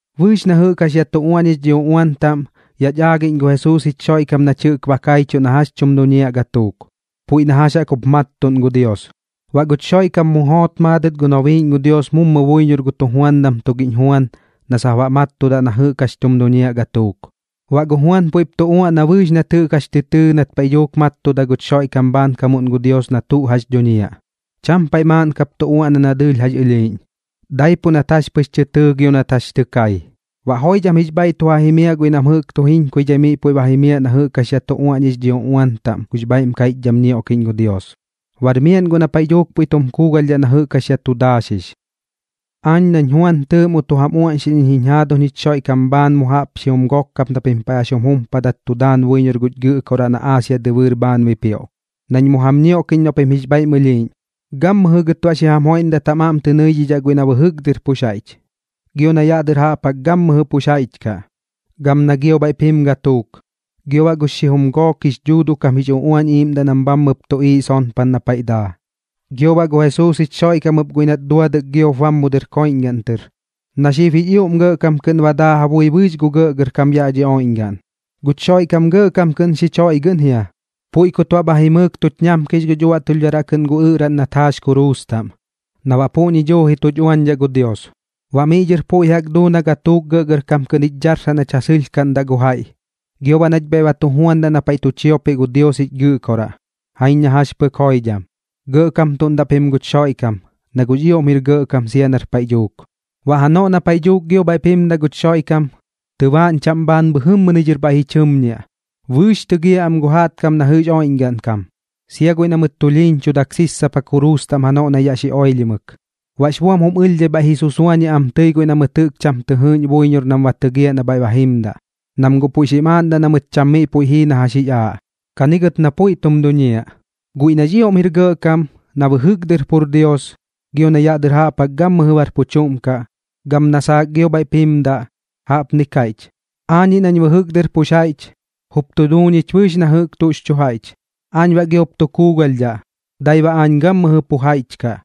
Bɨɨx na jɨꞌk jax yaꞌ tu uaꞌñix dhi uꞌuan taꞌm, yaꞌch aagiꞌñ gu Jesuus jich Xoiꞌkam nach jɨꞌk ba kaichuꞌ na jax tum duñiaꞌ gatuuk, puiꞌ na jax jaꞌk jup mattuꞌn gu Dios. Baꞌ guch Xoiꞌkam mu joot maadɨt gu nobiiꞌñ gu Dios mummu buiñor gu tujuandam tugiꞌñ Juan na sap baꞌ mattudaꞌ na jɨꞌk jax tum duñiaꞌ gatuuk. Baꞌ gu Juan puiꞌp tu uaꞌna bɨɨx nat jɨꞌk jax tɨ tɨɨ nat paiꞌ dhuuk mattuda guch Xoiꞌkam bhaankamuꞌn gu Dios na tuꞌ jax dhuñiaꞌ. Cham paiꞌ maaꞌn kap tu uaꞌna na dɨɨlh jax ɨlhiiꞌñ, daipuꞌ nat jax pɨx tɨ tɨɨ gio nat jax tɨ kai. Baꞌ joidham jix bhaiꞌ tu ja jimiaꞌ guiꞌ nam jɨꞌk tu jiñkaidhai miꞌ puiꞌ ba jimiaꞌ na jɨꞌk jax yaꞌ tu uaꞌñix dhi uꞌuan taꞌm gux bhaiꞌm kaiꞌchdham ñioꞌkiꞌñ gu Dios, bar miaꞌn guꞌ na paiꞌ dhuuk puiꞌ tum kuugalhdhaꞌ na jɨꞌk jax yaꞌ tu daaxix. Aañ nañ Juan tɨɨꞌ mu tu jam uaꞌñxiꞌñ iñ jiñ jaaduñ jich Xoiꞌkam bhaan mu jaꞌp xijum gok kap na pim paiꞌ jax jum jumpadat tu daan buiñor guch Gɨꞌkoraꞌ na Aasia dɨbɨɨr bhaan bipioꞌ, nañ mu jam ñioꞌkiꞌñ noꞌ pim jix bhaiꞌm ɨlhiiꞌñ. Gammɨjɨ gɨt baꞌ xi jam joiꞌndat jam aꞌm tɨ nɨidhidhaꞌ guiꞌ na bɨjɨk dɨr pux jaiꞌch, gio na yaꞌ dɨr jaꞌp jaꞌk gammɨjɨ pux jaiꞌch kaꞌ, gam na gio bhaiꞌp jim gatuuk, gio baꞌ gux xijum gook jix dhuuduꞌ kam jix uꞌuañ iꞌiiꞌmdaꞌ nam bhammɨp tuꞌiiꞌ sonpan na paiꞌ daa, gio baꞌ gu Jesuus jich Xoiꞌkam ɨp guiꞌ nat duadɨk giop bam mu dɨr koiꞌñgaꞌn tɨr, na xib jix ioꞌm gɇꞌkam kɨꞌn ba daa ja bui bɨɨx gu gɇꞌgɇrkam yaꞌ dhi oiꞌñgaꞌn. Guch Xoiꞌkam gɇꞌkam kɨꞌn xich joiꞌgɨꞌn jia, puiꞌ kut baꞌ bha jimɨɨk tuch ñamkix guch uaꞌtulhdharaꞌ kɨꞌn gu ɨꞌraꞌn nat jaax kuruus taꞌm, na baꞌ puꞌñi duuji tuch uañdhaꞌ gu Dios. Baꞌ miꞌ dhɨr puiꞌ jaꞌk duu na gatuuk gɇꞌgɇrkam kɨꞌn jich dharsaꞌ nach ja sɨlhkaꞌndaꞌ gu jaiꞌ, gio baꞌ nach bhaiꞌ ba tu juandaꞌ na paiꞌ tu chiopiꞌ gu Dios jich Gɨꞌkoraꞌ. Jaiñ na jax pɨk joidham. Gɇꞌkamtuꞌndaꞌ pim guch Xoiꞌkam, na guꞌx ioꞌm jir gɇꞌkam sia nar paiꞌ dhuuk. Baꞌ janoꞌ na paiꞌ dhuuk gio bhaiꞌp jimdaꞌ guch Xoiꞌkam, tɨbaaꞌñ chaꞌm bhaan bhɨjɨmmɨni dhɨr bhaiꞌ ji chɨmñiaꞌ. Bɨɨx tɨgiaꞌ am gu jaꞌtkam na jɨꞌx oiꞌñgaꞌn kam, sia guiꞌ na mɨt tulhiiñchudak sissapa kuruus taꞌm janoꞌ na yaꞌ xi oilhimɨk. Baꞌx buam jum ɨlhdhai bhaiꞌ ji susuañiaꞌ am tɨi guiꞌ na mɨt jɨꞌk cham tɨ jɨɨꞌñ buiñor nam ba tɨgiaꞌ na bhaiꞌ ba jimdaꞌ, nam guꞌ puiꞌ xim aaꞌndaꞌ na mɨt cham miꞌ puiꞌ jii na jax jix aaꞌ. Kani gɨt na puiꞌ tum duñiaꞌ. Guiꞌ nax ioꞌm jir gɇꞌkam, na bɨjɨk dɨr pur Dios, gio na yaꞌ dɨr jaꞌp jaꞌk gammɨjɨ bar pu chuꞌm kaꞌ, gam na saak gio bhaiꞌp jimdaꞌ, jaꞌpni kaiꞌch: “Aañiꞌ nañ bɨjɨk dɨr pux jaiꞌch, jup tu duu ñich bɨɨx na jɨꞌk tuꞌx chu jaiꞌch. Aañ baꞌ giop tu kuugalhdhaꞌ, dai baꞌ aañ gammɨjɨ pu jaiꞌch kaꞌ.”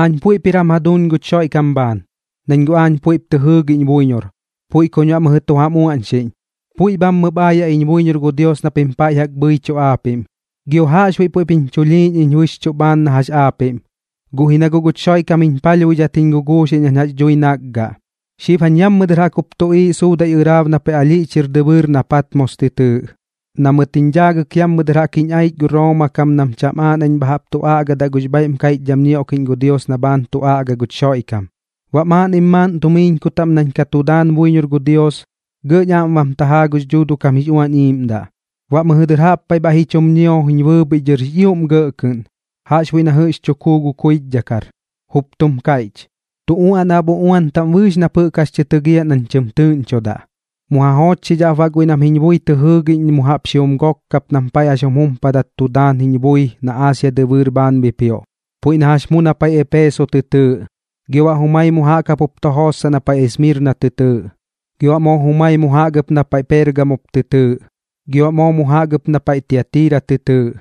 Aañ puiꞌp jir jam jaduuñ guch Xoiꞌkam bhaan, nañ guꞌ aañ puiꞌp tɨ jɨɨgiꞌñ buiñor, puiꞌ kuñ baꞌ mɨjɨ tu jam uaꞌñxiꞌñ, puiꞌ bhammɨp aayaꞌ iñ buiñor gu Dios na pim paiꞌ jaꞌk bhɨichuꞌ aapiꞌm. Gio jaꞌxbuiꞌ puiꞌp jiñ chulhiiñ iñ bɨxchuꞌ bhaan na jax aapiꞌm, guꞌ ji na guꞌ guch Xoiꞌkam jiñ palhbuidhat jiñ guguuxiꞌñ nañ jax dhui nakgaꞌ. Xib jañ yammɨ dɨr jaꞌk jup tuꞌiiꞌ suudaiꞌ ɨraab na paiꞌ alhiꞌch jir dɨbɨɨr na Patmos tɨ tɨɨꞌ, na mɨt jiñ dhaagɨk yammɨ dɨr jaꞌk jiñ aich gu Rooma kam nam cham aaꞌ nañ bha jaꞌp tu aꞌgadaꞌ gux bhaiꞌm kaiꞌchdham ñioꞌkiꞌñ gu Dios na bhaan tu aꞌga guch Xoiꞌkam. Baꞌ maaꞌnnim maaꞌn tumiiñku taꞌm nañ ka tu daan buiñor gu Dios, gɇꞌñ aꞌm bam tajaa gux Dhuuduꞌ kam jix Uañ Iiꞌmdaꞌ. Baꞌ mɨjɨ dɨr jaꞌp paiꞌ bhaiꞌ ji chum ñio jiñ bɨɨbhiꞌ dhɨr jix ioꞌm gɇꞌ kɨꞌn, jaꞌxbuiꞌ na jɨꞌx tu kuu gu kuichdhakar, jup tum kaiꞌch: ―Tu uaꞌnaꞌ ap uꞌuan taꞌm bɨɨx nap jɨꞌk jax tɨ tɨgiaꞌ nañ tɨm tɨɨꞌñchodaꞌ, mu ja joochxidhaꞌp baꞌ guiꞌ nam jiñ bui tɨ jɨɨgiꞌñ mu jaꞌp xijum gok kap nam paiꞌ jax jum jumpadaꞌ nam tu daan jiñ bui na Aasia dɨbɨɨr bhaan bipioꞌ, puiꞌ na jax mu na paiꞌ Eepeso tɨ tɨɨꞌ, gio baꞌ jumai mu jaꞌk jap jup tu jootsaꞌ na paiꞌ Esmirna tɨ tɨɨꞌ, gio baꞌ moo jumai mu jaꞌk ɨp na paiꞌ Peergamo jup tɨ tɨɨꞌ, gio baꞌ moo mu jaꞌk ɨp na paiꞌ Tiatira tɨ tɨɨꞌ,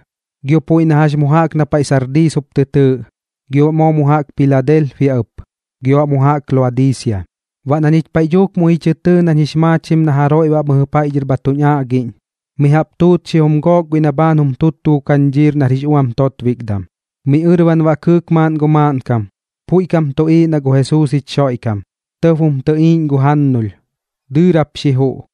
gio puiꞌ na jax mu jaꞌk na paiꞌ Sardiis jup tɨ tɨɨꞌ, gio baꞌ moo mu jaꞌk Piladelpia ɨp, gio baꞌ mu jaꞌk Laodiisia. Baꞌ na ñich paiꞌ dhuuk muiꞌ ji chɨ tɨɨ nañ jix maachim na jaroiꞌ baꞌ mɨjɨ paiꞌ dhɨr bha tuñ aꞌgiꞌñ, mi jaꞌp tuut xijum gook guiꞌ na bhaan jum tuttu gu kañdhiir nar jix uam totbikdam. Miꞌ ɨrban baꞌ kɨɨk maaꞌn gu maaꞌnkam, puiꞌ kam tuꞌiiꞌ na gu Jesuus jich Xoiꞌkam. Tɇb jum tɨꞌiiꞌñ gu jannulh, dɨɨrap xi juꞌ,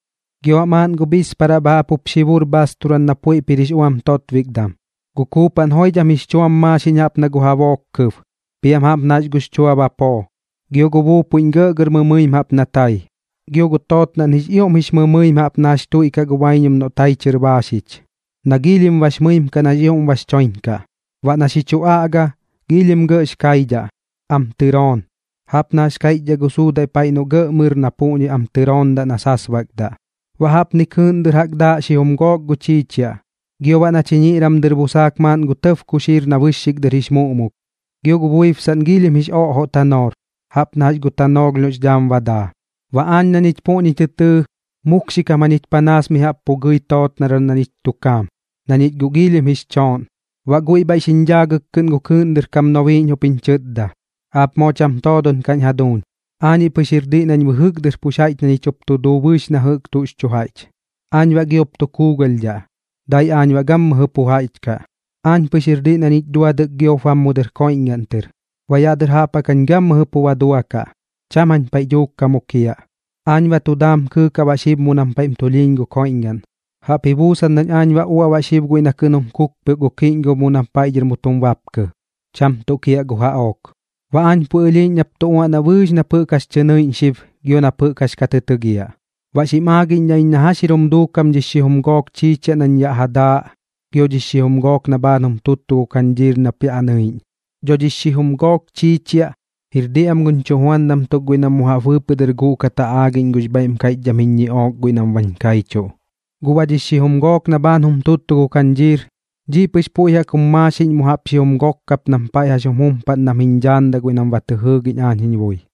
gio baꞌ maaꞌn gu bhisparaꞌ bha jaꞌp jup xi bur bhaasturam na puiꞌp jir jix uam totbikdam. Gu kuupaꞌn joidham jix chuam maaxiꞌñ jaꞌp na gu jabook kɨb, piam jaꞌp na jax gux chua bapoo, gio gu buupuiꞌñ gɇꞌgɇr mɨmɨim jaꞌp na tai. Gio gu tootnaꞌn jix ioꞌm jix mɨmɨim jaꞌp na jax tuiꞌkaꞌ gu baiñum noꞌ tai chɨr baaxich, na giilhim bax mɨim kaꞌ nax ioꞌm bax choiñ kaꞌ. Baꞌ na xi chu aꞌga, giilhim gɇꞌx kaidhaꞌ, am tɨroon, jaꞌp na jax kaiꞌchdhaꞌ gu suudaiꞌ paiꞌ noꞌ gɇꞌ mɨr na puꞌñi am tɨroondaꞌ na sasbakdaꞌ. Baꞌ jaꞌpni kɨɨꞌn dɨr ja daaꞌ xijum gook gu chiichiaꞌ, gio baꞌ na chiñiꞌram dɨr busaak maaꞌn gu tɇb kuxiir na bɨxxik dɨr jix muꞌmuk. Gio gu buibsaꞌn giilhim jix oꞌjoꞌ tanoor, jaꞌp na jax gu tanoolh noꞌx dhaam ba daa. Baꞌ aañ na ñich puꞌñi tɨɨ, mukxi kam jañich panaas mi jaꞌp pu gɨi tootnaram na ñich tu kaam, na ñich guꞌ giilhim jix chooꞌn. Baꞌ guiꞌ bhaiꞌ xiñ dhaagɨk kɨꞌn gu kɨɨꞌn dɨr kam nobiiꞌñ jup jiñ chɨtda: ―Aap moo cham toodon kaꞌñ jaduuñ. Aañiꞌ pɨx jir diꞌ nañ bɨjɨk dɨr pu jaiꞌch na ñich jup tu duu bɨɨx na jɨꞌk tuꞌx chu jaiꞌch. Aañ baꞌ giop tu kuugalhdhaꞌ, dai aañ baꞌ gammɨjɨ pu jaiꞌch kaꞌ. Aañ pɨx jir diꞌ na ñich duadɨk giop bam mu dɨr koiꞌñgaꞌn tɨr. Baꞌ yaꞌ dɨr jaꞌp jaꞌk jañ gammɨjɨ pu ba duakaꞌ, cham jañ paiꞌ dhuuk ka mukiaꞌ. Aañ ba tu daam kɨɨk baꞌ xib mu nam paiꞌm tulhiiñ gu koiꞌñgaꞌn, jaꞌp ji buusan nañ aañ ba uaꞌ baꞌ xib guiꞌ na kɨꞌn jum kukpioꞌk gu kiꞌñgob na paiꞌ dhɨr mu tum bapkɨ, cham tuꞌ kiaꞌ gu jaꞌook. Baꞌ aañ puiꞌ ɨlhiiꞌñ nap tu uaꞌnaꞌ bɨɨx nap jɨꞌk jax tɨ nɨiꞌñ xib gio nap jɨꞌk jax ka tɨ tɨgiaꞌ. Baꞌ xim aagiꞌñdhaꞌ iñ na jax jir jum duukam dhix xijum gook chiichiaꞌ nañ ja daaꞌ gio dhix xijum gook na bhaan jum tuttu gu kañdhiir nap yaꞌ nɨiꞌñ. Dho dhix xijum gook chiichiaꞌ, jir diꞌ am guñ chujuandam tuk guiꞌ nam mu jaꞌp bɨɨpɨꞌ dɨr guꞌkat ja aagiꞌñ gux bhaiꞌm kaiꞌchdham jiñ ñiꞌook guiꞌ nam bañ kaichuꞌ. Guꞌ baꞌ dhix xijum gook na bhaan jum tuttu gu kañdhiir, dhiꞌ pɨx puiꞌ jaꞌk jum maaxiꞌñ mu jaꞌp xijum gok kap nam paiꞌ jax jum jumpaꞌn nam jiñ dhaandaꞌ guiꞌ nam ba tɨ jɨɨgiꞌñ aañ jiñ bui.